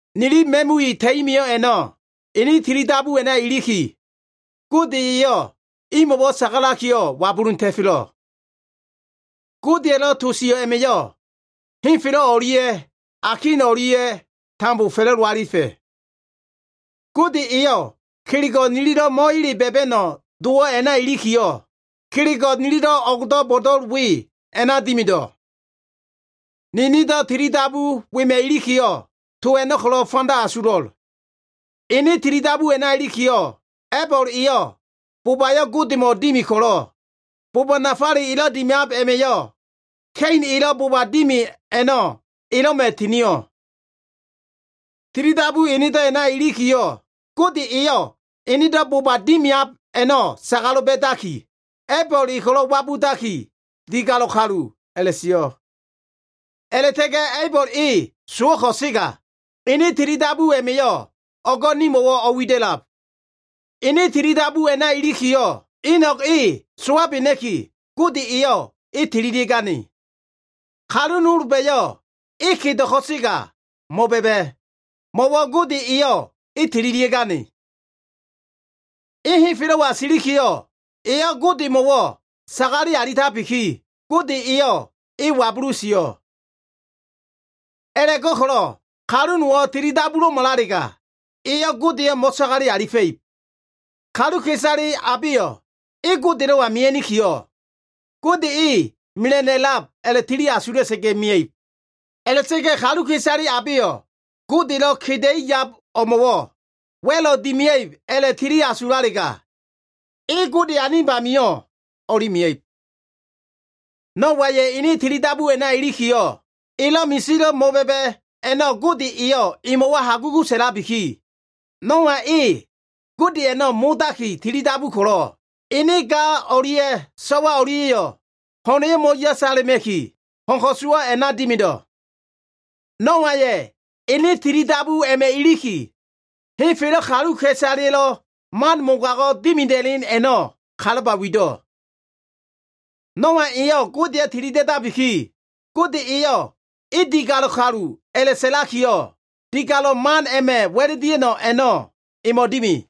Nili ma꞉mui ta꞉i mio꞉ a꞉no꞉, enen tilidabu a꞉na iliki, Gode eyo꞉ imo꞉wo꞉ sagalakiyo꞉ wabulun ta꞉felo꞉. Godeya꞉lo꞉ to sio꞉ a꞉ma꞉yo꞉ henfelo꞉ o꞉lia꞉ akin o꞉lia꞉yo꞉ tambo fa꞉la꞉do alifa꞉. Gode eyo꞉ kelego꞉ nililo꞉ mo꞉ele ba꞉ba꞉no꞉ dowo꞉ a꞉na ilikiyo꞉, kelego꞉ nililo꞉ o꞉gdo꞉ bo꞉do꞉l we a꞉na dimido꞉. Ninindo꞉ tilidabu wema꞉ ilikiyo꞉, to a꞉no꞉ ko꞉lo꞉ fanda asulo꞉l. Ene tilidabu a꞉na ilikiyo꞉, A꞉ibol eyo꞉ bobayo꞉ Godemo꞉ dimi ko꞉lo꞉, boba nafale elo꞉ dimiab a꞉ma꞉yo꞉ Ka꞉in elo꞉ boba dimi a꞉no꞉ elo꞉ma꞉ tinio꞉. Tilidabu enedo꞉ a꞉na ilikiyo꞉, Gode eyo꞉ ene boba dimiab a꞉no꞉ sagalo꞉ ba꞉daki, A꞉ibol e ko꞉lo꞉ wabudaki, digalo꞉ kalu a꞉la꞉sio꞉. A꞉la꞉ta꞉ga꞉ A꞉ibol e sowo꞉ ko꞉sega, ene tilidabu a꞉ma꞉yo꞉ o꞉go꞉ nimo꞉wo꞉ o꞉wida꞉lab. Ene tilidabu a꞉na ilikiyo꞉, Inog e sowabena꞉ki, Gode eyo꞉ e tililia꞉gane. Kalu nolba꞉yo꞉ e kedo꞉ ko꞉sega mo꞉ba꞉ba꞉, mo꞉wo꞉ Gode eyo꞉ e tililia꞉gane. E henfelo꞉wa silikiyo꞉, eyo꞉ Godemo꞉wo꞉ sagale alitabiki, Gode eyo꞉ e wabulu sio꞉. A꞉la꞉go꞉ko꞉lo꞉ kalu nowo꞉ tilidabulo꞉malalega, eyo꞉ Godeyo꞉ mo꞉sagale alifa꞉ib. Kaluka꞉isale abeyo꞉ e Godelo꞉wa mia꞉nikiyo꞉, Gode e mela꞉no꞉ a꞉lab a꞉la꞉tili asula꞉sa꞉ga꞉ mia꞉ib. A꞉la꞉ta꞉ga꞉ kaluka꞉isale abeyo꞉ Godelo꞉ keda꞉i yab o꞉mo꞉wo꞉ wa꞉lo꞉ dimia꞉ib a꞉la꞉tili asulalega, e Gode anib amio꞉ o꞉li mia꞉ib. Noaya꞉ ene tilidabu a꞉na ilikiyo꞉, elo꞉ misilo꞉ mo꞉ba꞉ba꞉ a꞉no꞉ Gode eyo꞉ emo꞉wo꞉ hagugu sa꞉labiki, Noa e Gode a꞉no꞉ modaki tilidabu ko꞉lo꞉, ene ga o꞉lia꞉ so꞉wa o꞉lia꞉yo꞉ ho꞉na꞉yo꞉ mo꞉yasala꞉ma꞉ki, ho꞉n ko꞉suwo꞉ a꞉na dimido꞉. Noaya꞉ ene tili dabu a꞉ma꞉ iliki, henfelo꞉ kaluka꞉isaleya꞉lo꞉ man mogago꞉ dimida꞉len a꞉no꞉ kalaba wido꞉. Noa eyo꞉ Godeyo꞉ tilida꞉dabiki, Gode eyo꞉ e digalo꞉ kalu a꞉la꞉sa꞉lakiyo꞉, digalo꞉ man a꞉ma꞉ wa꞉l dia꞉no꞉ a꞉no꞉ emo꞉ dimi.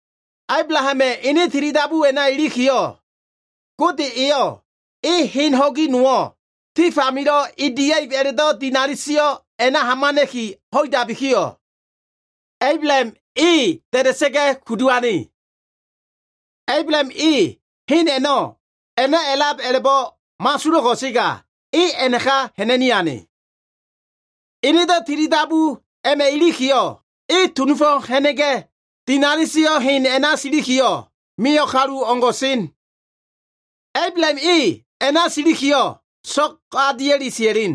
Ablahama꞉ ene tilidabu a꞉na ilikiyo꞉, Gode eyo꞉ e hen ho꞉gi nowo꞉, tif amilo꞉ e dia꞉ib a꞉la꞉do꞉ dinali sio꞉ a꞉na hamana꞉ki ho꞉idabikiyo꞉, Ablaham e da꞉da꞉sa꞉ga꞉ kudu ane. Ablaham e hen a꞉no꞉ a꞉na a꞉lab a꞉la꞉bo꞉ mo꞉asulo꞉ ko꞉sega, e a꞉naka ha꞉na꞉ni ane. Enedo꞉ tilidabu a꞉ma꞉ ilikiyo꞉, e tunufo꞉ ha꞉na꞉ga꞉, dinali sio꞉ hen a꞉na silikiyo꞉, mio꞉ kalu o꞉ngo꞉ sen. Ablaham e a꞉na silikiyo꞉, so꞉g a dia꞉li sia꞉len.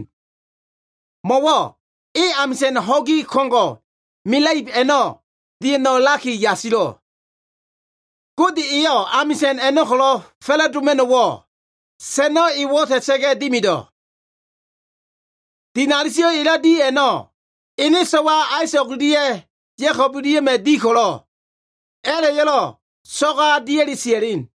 Mo꞉wo꞉ e amisa꞉n ho꞉gi ko꞉ngo꞉ mela꞉ib a꞉no꞉ dia꞉no꞉ a꞉laki yasilo꞉. Gode eyo꞉ amisa꞉n a꞉no꞉ ko꞉lo꞉ fa꞉la꞉doma꞉no꞉wo꞉ sa꞉no꞉ e wo꞉ta꞉sa꞉ga꞉ dimido꞉. Dinali sio꞉ elo꞉ di a꞉no꞉, ene so꞉wa Aisa꞉g o꞉lia꞉ Ya꞉kob o꞉lia꞉ma꞉ di ko꞉lo꞉, a꞉la꞉yo꞉lo꞉ so꞉g a dia꞉li sia꞉len.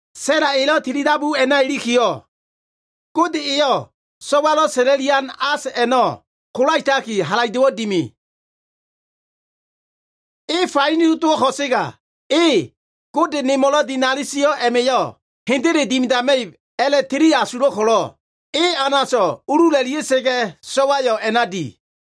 Sa꞉la elo꞉ tilidabu a꞉na ilikiyo꞉, Gode eyo꞉ so꞉walo꞉ sa꞉la꞉lian as a꞉no꞉ kolaetaki, halaido꞉wo꞉ dimi. E faino dowo꞉ ko꞉sega, e “Gode nemo꞉lo꞉ dinali sio꞉ a꞉ma꞉yo꞉ hendele dimidama꞉ib” a꞉la꞉tili asulo꞉ ko꞉lo꞉, e anaso꞉ ulula꞉lia꞉sa꞉ga꞉ so꞉wayo꞉ a꞉na di.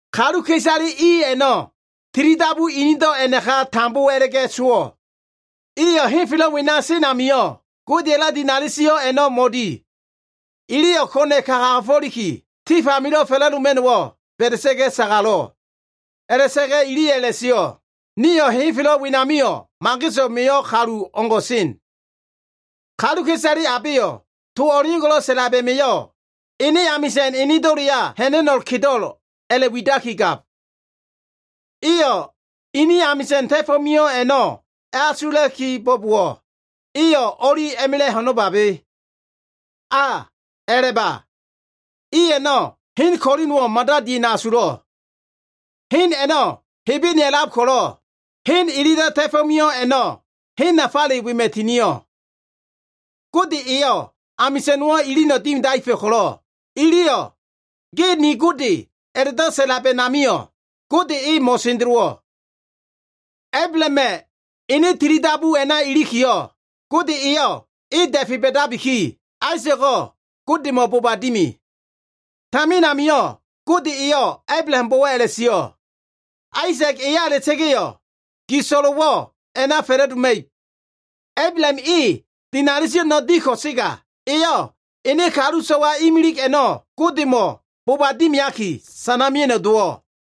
Kaluka꞉isale i a꞉no꞉ tili dabu inido꞉ a꞉naka tambo a꞉la꞉ga꞉ sowo꞉. Iyo꞉ henfelo꞉ wena sen amio꞉, Godeya꞉lo꞉ dinali sio꞉ a꞉no꞉ mo꞉di. Iliyo꞉ ko꞉na꞉ka kagafo꞉liki, tif amilo꞉ fa꞉la꞉doma꞉no꞉wo꞉ ba꞉da꞉ga꞉ sagalo꞉. A꞉la꞉ta꞉ga꞉ iliyo꞉ a꞉la꞉sio꞉, “Nio꞉ henfelo꞉ wenamio꞉ mageso꞉ mio꞉ kalu o꞉ngo꞉ sen.” Kaluka꞉isale abeyo꞉ to o꞉leo꞉ngo꞉lo꞉ sa꞉lab a꞉ma꞉yo꞉ ene amisa꞉n enedo꞉leya ha꞉na꞉no꞉ kedo꞉l a꞉la꞉widakigab. Iyo꞉ ini amisa꞉n ta꞉fo꞉ mio꞉ a꞉no꞉ a꞉asulai kibo꞉bowo꞉, iyo꞉ o꞉li a꞉ma꞉la꞉ ho꞉no꞉babe. A, a꞉la꞉ba. I a꞉no꞉ hen ko꞉li nowo꞉ mada dia꞉no꞉ asulo꞉. Hen a꞉no꞉ Hebene a꞉lab ko꞉lo꞉, hen ililo꞉ ta꞉fo꞉ mio꞉ a꞉no꞉ hen nafale wema꞉ tinio꞉. Gode eyo꞉ amisa꞉n nowo꞉ ilino꞉ dimidaefa꞉ ko꞉lo꞉, iliyo꞉ “Ge ni Gode” a꞉la꞉do꞉ sa꞉lab a꞉namio꞉, Gode e mo꞉sendelowo꞉. Ablahama꞉ ene tili dabu a꞉na ilikiyo꞉, Gode eyo꞉ e da꞉fe ba꞉dabiki, Aisa꞉go꞉ Godemo꞉ boba dimi. Tamin amio꞉ Gode eyo꞉ Ablahambo꞉wo꞉ a꞉la꞉sio꞉, “Aisa꞉g eya a꞉la꞉ta꞉ga꞉yo꞉ gi so꞉lo꞉wo꞉ a꞉na fa꞉la꞉doma꞉ib.” Ablaham e dinali sio꞉ a꞉no꞉ di ko꞉sega, eyo꞉ ene kalu so꞉wa imilig a꞉no꞉ Godemo꞉ boba dimiaki, sana mea꞉no꞉ dowo꞉.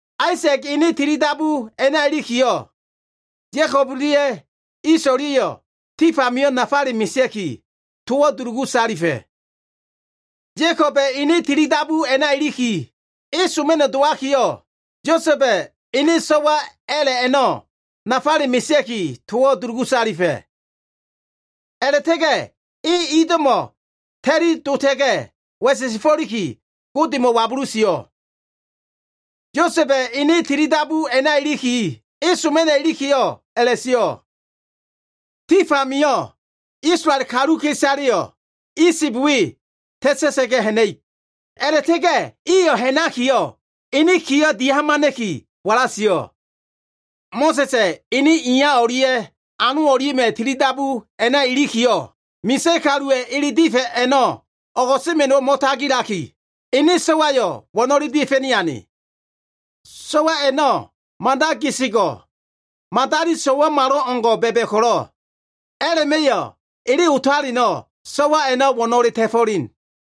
Aisa꞉ga꞉ ene tilidabu a꞉na ilikiyo꞉, Ya꞉kob o꞉lia꞉ Iso꞉ o꞉lia꞉yo꞉ tif amio꞉ nafale mesea꞉ki, towo꞉ dulugu salifa꞉. Ya꞉koba꞉ ene tilidabu a꞉na iliki, e soma꞉no꞉ dowakiyo꞉ Yosa꞉ba꞉ ene so꞉wa a꞉la꞉ a꞉no꞉ nafale mesea꞉ki, towo꞉ dulugu salifa꞉. A꞉la꞉ta꞉ga꞉ e ido꞉mo꞉ ta꞉li dota꞉ga꞉ wa꞉sesefo꞉liki, Godeyo꞉ wabulu sio꞉. Yosa꞉ba꞉ ene tilidabu a꞉na iliki, e soma꞉no꞉ ilikiyo꞉ a꞉la꞉sio꞉, “Tif amio꞉ Isolael kaluka꞉isaleyo꞉ Isib we ta꞉ta꞉ga꞉ ha꞉na꞉ib.” A꞉la꞉ta꞉ga꞉ iyo꞉ ha꞉nakiyo꞉ ene kiyo꞉ dia꞉hamana꞉ki wala sio꞉. Mo꞉sa꞉sa꞉ ene iya o꞉lia꞉ ano o꞉lia꞉ma꞉ tili dabu a꞉na ilikiyo꞉, misa꞉ kaluwa꞉ ele difa꞉ a꞉no꞉ o꞉go꞉sema꞉no꞉wo꞉ mo꞉tagilaki, ene so꞉wayo꞉ wo꞉no꞉le dia꞉fa꞉ni ane. So꞉wa a꞉no꞉ mada gesego꞉, madali so꞉wamalo꞉ngo꞉ ba꞉ba꞉ ko꞉lo꞉, a꞉la꞉ma꞉yo꞉ ele otaleno꞉ so꞉wa a꞉no꞉ wo꞉no꞉le ta꞉fo꞉len.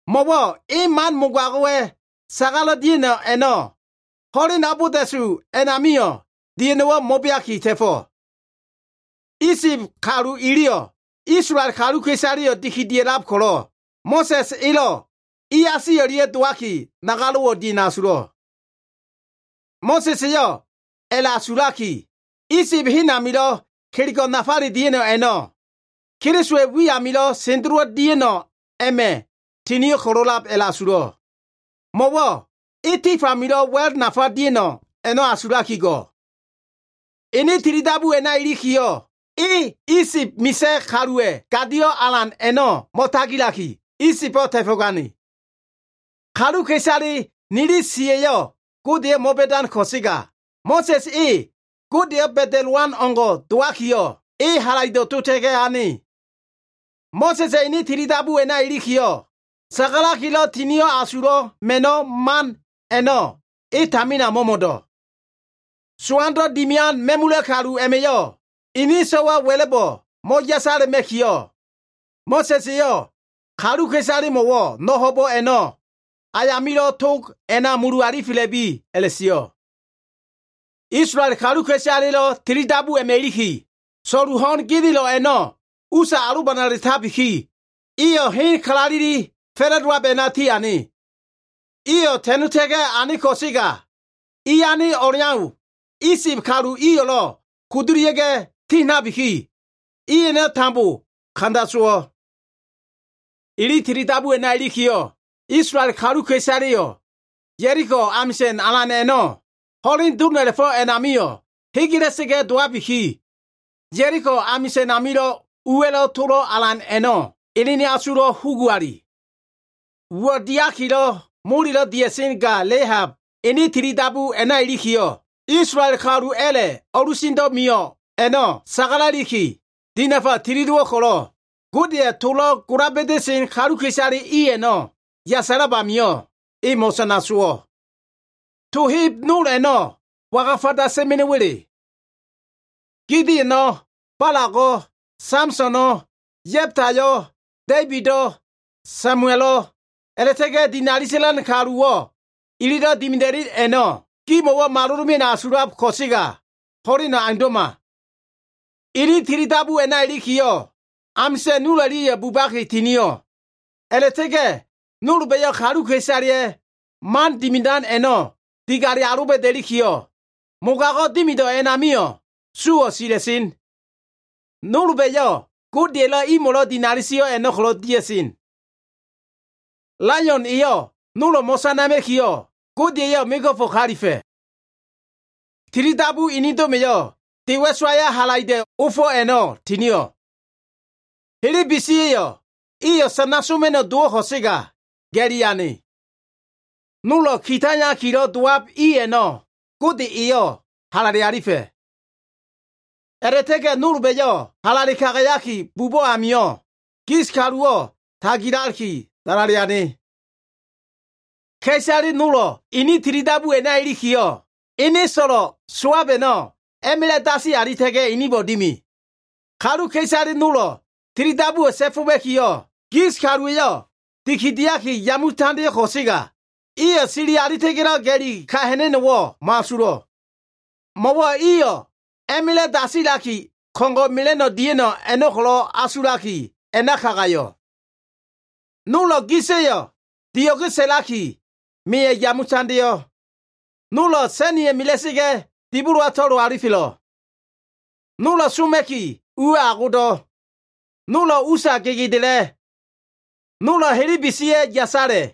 Mo꞉wo꞉ e man mogago꞉wa꞉ sagalo꞉ dia꞉no꞉ a꞉no꞉ ho꞉len abolda꞉su a꞉namio꞉ dia꞉no꞉wo꞉ mo꞉beaki ta꞉fo꞉. Isib kalu iliyo꞉ Isolael kaluka꞉isaleyo꞉ dikidia꞉lab ko꞉lo꞉, Mo꞉sa꞉s elo꞉ iasi o꞉lia꞉ dowaki, nagalo꞉wo꞉ dia꞉no꞉ asulo꞉. Mo꞉sa꞉s eyo꞉ a꞉la꞉asulaki, Isib hen amilo꞉ kelego꞉ nafale dia꞉no꞉ a꞉no꞉, Kelisowa꞉ wi amilo꞉ sendelowo꞉ dia꞉no꞉ a꞉ma꞉ tinio꞉ ko꞉lo꞉lab a꞉la꞉asulo꞉. Mo꞉wo꞉ e tif amilo꞉ wa꞉l nafa dia꞉no꞉ a꞉no꞉ asulaki go꞉. Ene tilidabu a꞉na ilikiyo꞉, e Isib misa꞉ kaluwa꞉ gadio꞉ alan a꞉no꞉ mo꞉tagilaki, Isibo꞉ ta꞉fo꞉gane. Kaluka꞉isale nili siya꞉yo꞉ Godeyo꞉ mo꞉ba꞉dan ko꞉sega, Mo꞉sa꞉s e Godeyo꞉ ba꞉da꞉lowan o꞉ngo꞉ dowakiyo꞉, e halaido꞉ dota꞉ga꞉ ane. Mo꞉sa꞉sa꞉ ene tilidabu a꞉na ilikiyo꞉, sagalakilo꞉ Tinio꞉ Asulo꞉ Ma꞉no꞉ man a꞉no꞉ e tamina mo꞉mo꞉do꞉. Sowando꞉ dimian ma꞉mula꞉ kalu a꞉ma꞉yo꞉ ini so꞉wa wa꞉la꞉bo꞉ mo꞉yasala꞉ma꞉kiyo꞉, Mo꞉sa꞉s eyo꞉ kaluka꞉isalemo꞉wo꞉ no꞉ ho꞉bo꞉ a꞉no꞉ ayamilo꞉ tog a꞉na mulu alifela꞉bi a꞉la꞉sio꞉. Isolael kaluka꞉isaleya꞉lo꞉ tilidabu a꞉ma꞉ iliki, so꞉lu ho꞉n genelo꞉ a꞉no꞉ usa alobanala꞉tabiki, iyo꞉ hen kalaleli fa꞉la꞉dowab a꞉na tiane. Iyo꞉ ta꞉nota꞉ga꞉ ane ko꞉sega, i ane o꞉leau Isib kalu iyo꞉lo꞉ kudulia꞉ga꞉ tinabiki, i a꞉no꞉ tambo kanda sowo꞉. Ili tilidabu a꞉na ilikiyo꞉, Isolael kaluka꞉isaleyo꞉ Ya꞉liko amisa꞉n alan a꞉no꞉ ho꞉len dom a꞉la꞉fo꞉ a꞉namio꞉ hegela꞉sa꞉ga꞉ dowabiki, Ya꞉liko amisa꞉n amilo꞉ uwa꞉lo꞉ tolo꞉ alan a꞉no꞉ enen asulo꞉ huguali. Uwo꞉ diakilo꞉ molelo꞉ dia꞉sen ga Lehab, ene tilidabu a꞉na ilikiyo꞉, Isolael kalu a꞉la꞉ o꞉lusendo꞉ mio꞉ a꞉no꞉ sagala꞉liki, dinafa tili dowo꞉ ko꞉lo꞉, Godeya꞉ tolo꞉ gola ba꞉da꞉sen kaluka꞉isale i a꞉no꞉ yasalab amio꞉, e mo꞉sana sowo꞉. To heb nol a꞉no꞉ waga fanda sa꞉ma꞉no꞉wa꞉le? Gideono꞉, Balago꞉, Samsono꞉, Ya꞉btayo꞉, Da꞉ibido꞉, Samuelo꞉, a꞉la꞉ta꞉ga꞉ dinali sa꞉lan kaluwo꞉lo꞉, ililo꞉ dimida꞉len a꞉no꞉ gimo꞉ malolo꞉ mea꞉no꞉ asulab ko꞉sega ho꞉leno꞉ aundo꞉ma. Ini tili dabu a꞉na ilikiyo꞉, amisa꞉n nol o꞉lia꞉ bubaki tinio꞉, a꞉la꞉ta꞉ga꞉ nolba꞉yo꞉ kaluka꞉isaleya꞉ man dimidan a꞉no꞉ digale aloba꞉da꞉likiyo꞉, mogago꞉ dimido꞉ a꞉namio꞉ suwo꞉ sila꞉sen. Nolba꞉yo꞉ Godeya꞉lo꞉ imo꞉lo꞉ dinali sio꞉ a꞉no꞉ ko꞉lo꞉ dia꞉sen. Laion eyo꞉ nolo꞉ mo꞉sanama꞉kiyo꞉, Gode eyo꞉ mego꞉fo꞉ kalifa꞉. Tilidabu inido꞉ma꞉yo꞉ de wa꞉sowaya꞉ halaido꞉ ofo꞉ a꞉no꞉ tinio꞉. Helebesiya꞉yo꞉ iyo꞉ sana soma꞉no꞉ dowo꞉ ko꞉sega ga꞉li ane. Nolo꞉ ki taiyakilo꞉ dowab i a꞉no꞉ Gode eyo꞉ halale alifa꞉. A꞉la꞉ta꞉ga꞉ nolba꞉yo꞉ halale kagayaki bubo꞉ amio꞉, gis kaluwo꞉ tagilaki dalale ane. Ka꞉isale nolo꞉ ini tilidabu a꞉na ilikiyo꞉, ene so꞉lo꞉ sowab a꞉no꞉ a꞉ma꞉la꞉ dasi alita꞉ga꞉ inibo꞉ dimi. Kaluka꞉isale nolo꞉ tilidabuwo꞉ ta꞉foma꞉kiyo꞉, gis kaluwa꞉yo꞉ dikidiaki yame tandeo꞉ ko꞉sega, iyo꞉ sili alita꞉ga꞉lo꞉ ga꞉li ka ha꞉na꞉no꞉wo꞉ mo꞉asulo꞉. Mo꞉wo꞉ iyo꞉ a꞉ma꞉la꞉ dasilaki ko꞉ngo꞉ mela꞉no꞉ dia꞉no꞉ a꞉no꞉ ko꞉lo꞉ asulaki, a꞉na kagayo꞉. Nolo꞉ gisa꞉yo꞉ dio꞉ge sa꞉laki, meya꞉ yame tandeo꞉. Nolo꞉ sa꞉niya꞉ mela꞉sa꞉ga꞉, dibolowa to꞉lo alifelo꞉. Nolo꞉ soma꞉ki uwa꞉ agodo꞉. Nolo꞉ usa gegedela꞉. Nolo꞉ helebe siya꞉ yasala꞉.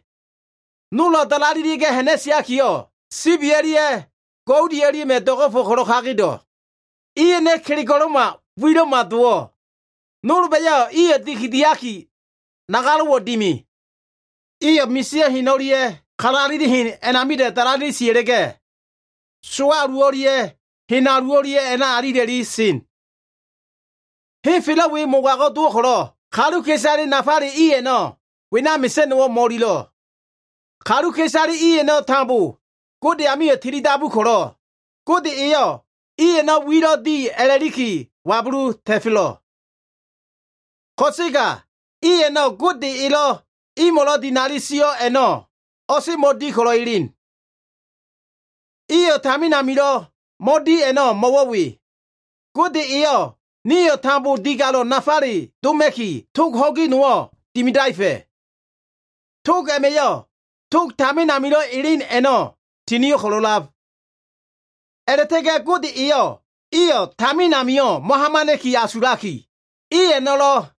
Nolo꞉ dalalelia꞉ga꞉ ha꞉na꞉siakiyo꞉, sibi o꞉lia꞉ goudi o꞉lia꞉ma꞉ do꞉go꞉fo꞉ ko꞉lo꞉ kagedo꞉. I a꞉no꞉ kelego꞉lo꞉ma wilo꞉ma dowo꞉. Nolba꞉yo꞉ iyo꞉ dikidiaki, nagalo꞉wo꞉ dimi. Iyo꞉ misio꞉ hen o꞉lia꞉ kalaleli hen a꞉namida꞉ dalalelia꞉ sia꞉la꞉ga꞉, sowa alu o꞉lia꞉ hen alu o꞉lia꞉ a꞉na alila꞉li sen. Henfelo꞉ we mogago꞉ dowo꞉ ko꞉lo꞉, kaluka꞉isale nafale i a꞉no꞉ wena mesa꞉no꞉wo꞉ mo꞉ililo꞉. Kaluka꞉isale i a꞉no꞉ tambo Gode amio꞉ tilidabu ko꞉lo꞉, Gode eyo꞉ i a꞉no꞉ wilo꞉ di a꞉la꞉liki wabulun ta꞉felo꞉. Ko꞉sega i a꞉no꞉ Gode elo꞉ imo꞉lo꞉ dinali sio꞉ a꞉no꞉ o꞉semo꞉ di ko꞉lo꞉ elen. Iyo꞉ tamin amilo꞉ mo꞉di a꞉no꞉ mo꞉wo꞉ we. Gode eyo꞉ nio꞉ tambo digalo꞉ nafale doma꞉ki tog ho꞉gi nowo꞉ dimidaefa꞉. Tog a꞉ma꞉yo꞉ tog tamin amilo꞉ elen a꞉no꞉ tinio꞉ ko꞉lo꞉lab. A꞉la꞉ta꞉ga꞉ Gode eyo꞉ iyo꞉ tamin amio꞉ mo꞉hamana꞉ki asulaki, i a꞉no꞉lo꞉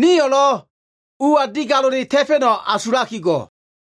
nio꞉lo꞉ ua digalo꞉le ta꞉fa꞉no꞉ asulaki go꞉.